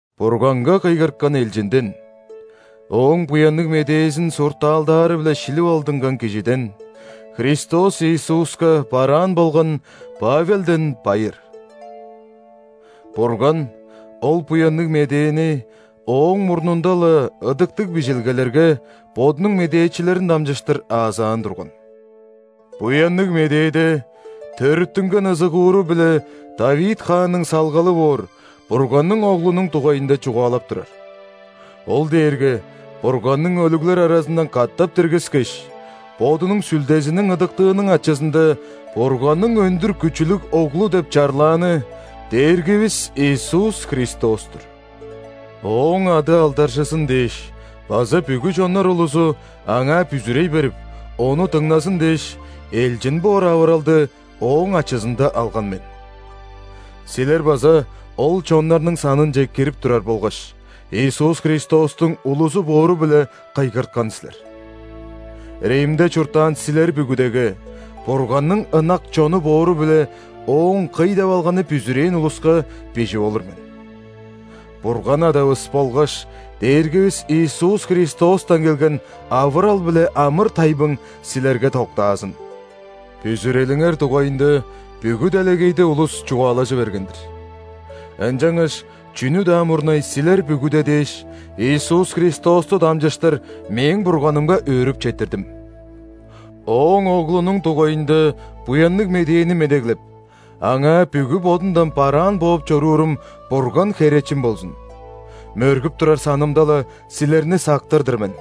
Бурганга кыйгырткан элчинден, Ооң Буянныг Медээзин суртаалдаары-биле шилип алдынган кижиден – Христос Иисуска бараан болган Павелден байыр. Бурган ол Буянныг Медээни ооң мурнунда-ла Ыдыктыг Бижилгелерге Бодунуң медээчилерин дамчыштыр аазаан турган. Буянныг Медээде төрүттүнген ызыгууру-биле ·Давид хаанның салгалы боор Бурганның Оглунуң дугайында чугаалап турар. Ол дээрге Бурганның өлүглер аразындан катап диргискеш, Бодунуң Сүлдезиниң ыдыктыының ачызында Бурганның өндүр күчүлүг Оглу деп чарлааны Дээргивис Иисус Христос-тур. Ооң ады алдаржызын дээш база бүгү чоннар улузу Аңаа бүзүрей берип, Ону дыңназын дээш, элчин боор авыралды Ооң ачызында алган мен. Силер база ол чоннарның санынче кирип турар болгаш, Иисус Христостуң улузу боору-биле кыйгырткан силер. Римде чурттаан силер бүгүдеге – Бурганның ынак чону боору-биле Ооң кый деп алганы бүзүрээн улуска – бижип олур мен. Бурган Адавыс болгаш Дээргивис Иисус Христостан келген авырал биле амыр-тайбың силерге доктаазын! Бүзүрелиңер дугайында бүгү делегейде улус чугаалажы берген-дир. Ынчангаш чүнү-даа мурнай силер бүгүде дээш, Иисус Христосту дамчыштыр мээң Бурганымга өөрүп четтирдим. Ооң Оглунуң дугайында Буянныг Медээни медеглеп, Аңаа бүгү бодумдан бараан бооп чоруурум Бурган херечим болзун: мөргүп турар санымда-ла, силерни сактыр-дыр мен.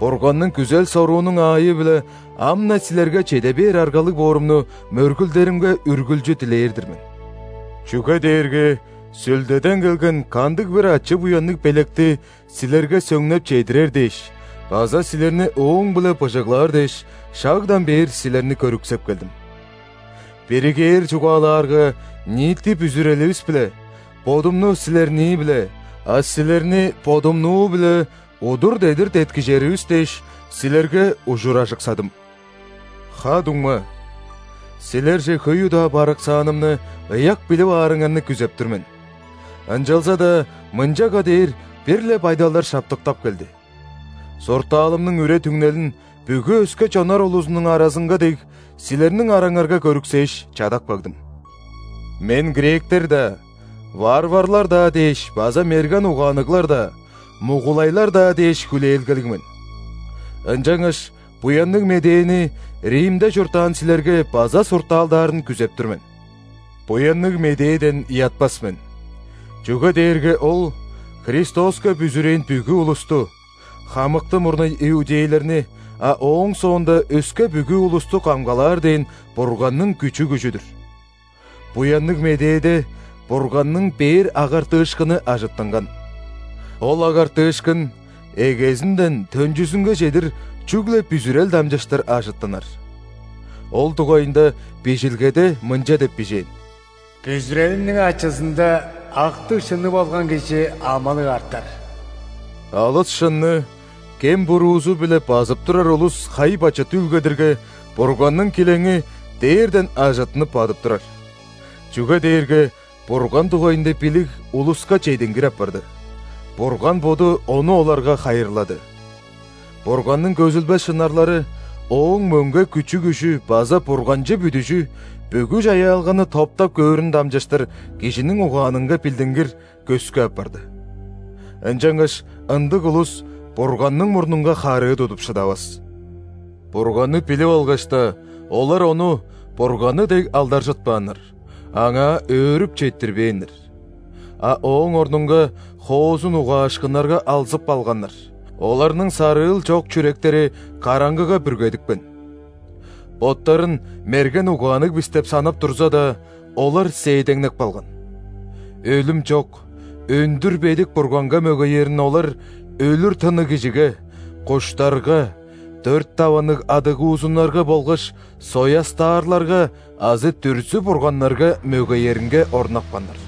Бурганның күзел-соруунуң аайы-биле ам-на силерге чеде бээр аргалыг боорумну мөргүлдеримге үргүлчү дилээр-дир мен. Чүге дээрге Сүлдеден келген кандыг-бир ачы-буянныг белекти силерге сөңнеп чедирер дээш база силерни ооң-биле быжыглаар дээш, шагдан бээр силерни көрүксеп келдим. Биригээр чугаалаарга, ниити бүзүреливис-биле: бодумну – силернии-биле, а силерни – бодумнуу-биле удур-дедир деткижеривис дээш, силерге ужуражыксадым. Ха-дуңма, силерже хөй удаа барыксаанымны ыяк билип аарыңарны күзеп тур мен (ынчалза-даа мынчага дээр бир-ле байдалдар шаптыктап келди). Суртаалымның үре-түңнелин, бүгү өске чоннар улузунуң аразынга дег, силерниң араңарга көрүксээш, чадап кагдым. Мен гректер-даа, варварлар-даа дээш база мерген угаанныглар-даа, мугулайлар-даа дээш хүлээлгелиг мен. Ынчангаш Буянныг Медээни Римде чурттаан силерге база суртаалдаарын күзеп тур мен. Буянныг Медээден ыятпас мен, чүге дээрге ол – Христоска бүзүрээн бүгү улусту: хамыкты мурнай иудейлерни, а ооң соонда өске бүгү улусту камгалаар дээн Бурганның күчү-күжү-дүр. Буянныг Медээде Бурганның бээр агартыышкыны ажыттынган. Ол агартыышкын эгезинден төнчүзүнге чедир чүгле бүзүрел дамчыштыр ажыттынар. Ол дугайында Бижилгеде мынча деп бижээн: «Бүзүрелиниң ачызында актыг-шынныг болган кижи амылыг артар». Алыс шынны кем-буруузу-биле базып турар улус хай-бачыт үүлгедирге, Бурганның килеңи дээрден ажыттынып бадып турар. Чүге дээрге Бурган дугайында билиг улуска чедингир апарды, Бурган Боду ону оларга хайырлады. Бурганның көзүлбес шынарлары – Ооң мөңге күчү-күжү база бурганчы бүдүжү бүгү чаяалганы топтап көөрүн дамчыштыр кижиниң угаанынга билдингир, көскү апарды. Ынчангаш ындыг улус Бурганның мурнунга харыы тудуп шыдавас! Бурганны билип алгаш-даа, олар Ону Бурганны дег алдаржытпааннар, Аңаа өөрүп четтирбээннер. А ооң орнунга хоозун угаашкыннарга алзып алганнар, оларның сарыыл чок чүректери караңгыга бүргедипкен. Боттарын мерген угаанныг бис деп санап турза-даа, олар сээдеңнеп калган. Өлүм чок, өндүр бедик Бурганга мөгеерин олар өлүр тынныг кижиге, куштарга, дөрт даванныг адыгуузуннарга болгаш соястаарларга азы дүрзү-бурганнарга мөгееринге орнапканнар.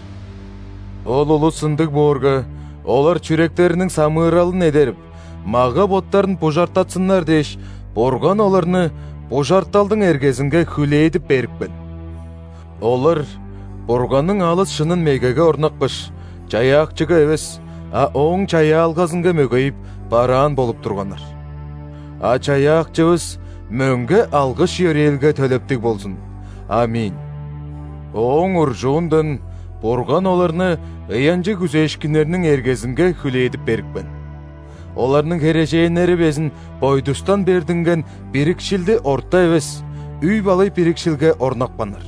Ол улус ындыг боорга, олар чүректериниң самыыралын эдерип, мага-боттарын бужартатсыннар дээш, Бурган оларны бужарталдың эргезинге хүлээдип берипкен. Олар Бурганның алыс шынын мегеге орнапкаш, Чаяакчыга эвес, а Ооң чаяалгазынга мөгейип, бараан болуп турганнар. А Чаяакчывыс мөңге алгыш-йөрээлге төлептиг болзун. Аминь! Ооң уржуундан Бурган оларны ыянчыг күзээшкиннерниң эргезинге хүлээдип берипкен: оларның херээженнери безин бойдустан бердинген бирикшилди орта эвес, үй-балай бирикшилге орнапканнар.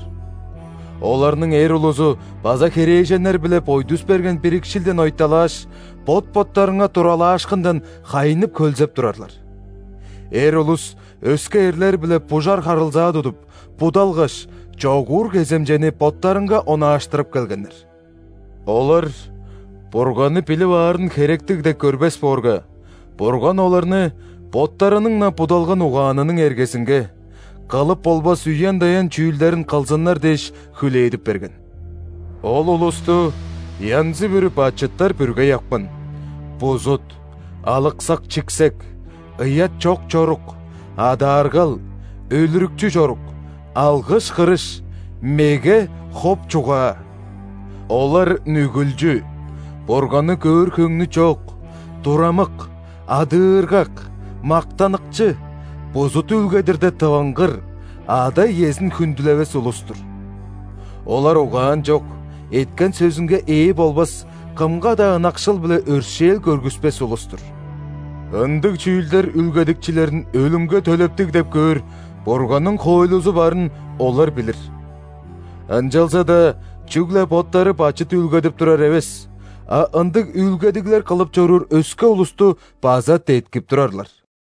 Оларның эр улузу база херээженнер-биле бойдус берген бирикшилден ойталааш, бот-боттарынга туралаашкындан хайнып-хөлзеп турарлар. Эр улус өске эрлер-биле бужар харылзаа тудуп, будалгаш, чогуур кеземчени боттарынга онааштырып келгеннер. Олар Бурганны билип аарын херектиг деп көрбес боорга, Бурган оларны боттарының-на будалган угаанының эргезинге, кылып болбас үен-даян чүүлдерин кылзыннар дээш, хүлээдип берген. Ол улусту янзы-бүрү бачыттар бүргей апкан: бузут, алыксак-чиксек, ыят чок чорук, адааргал, өлүрүкчү чорук, алгыш-кырыш, меге, хоп чугаа. Олар нүгүлчү, Бурганны көөр хөңнү чок, турамык, адыыргак, мактаныкчы, бузут үүлгедирде тывынгыр, ада-иезин хүндүлевес улус-тур. Олар угаан чок, эткен сөзүнге ээ болбас, кымга-даа ынакшыл биле өршээл көргүспес улус-тур. Ындыг чүүлдер үүлгедикчилерин өлүмге төлептиг деп көөр Бурганның хоойлузу барын олар билир. Ынчалза-даа чүгле боттары бачыт үүлгедип турар эвес, а ындыг үүлгедиглер кылып чоруур өске улусту база деткип турарлар.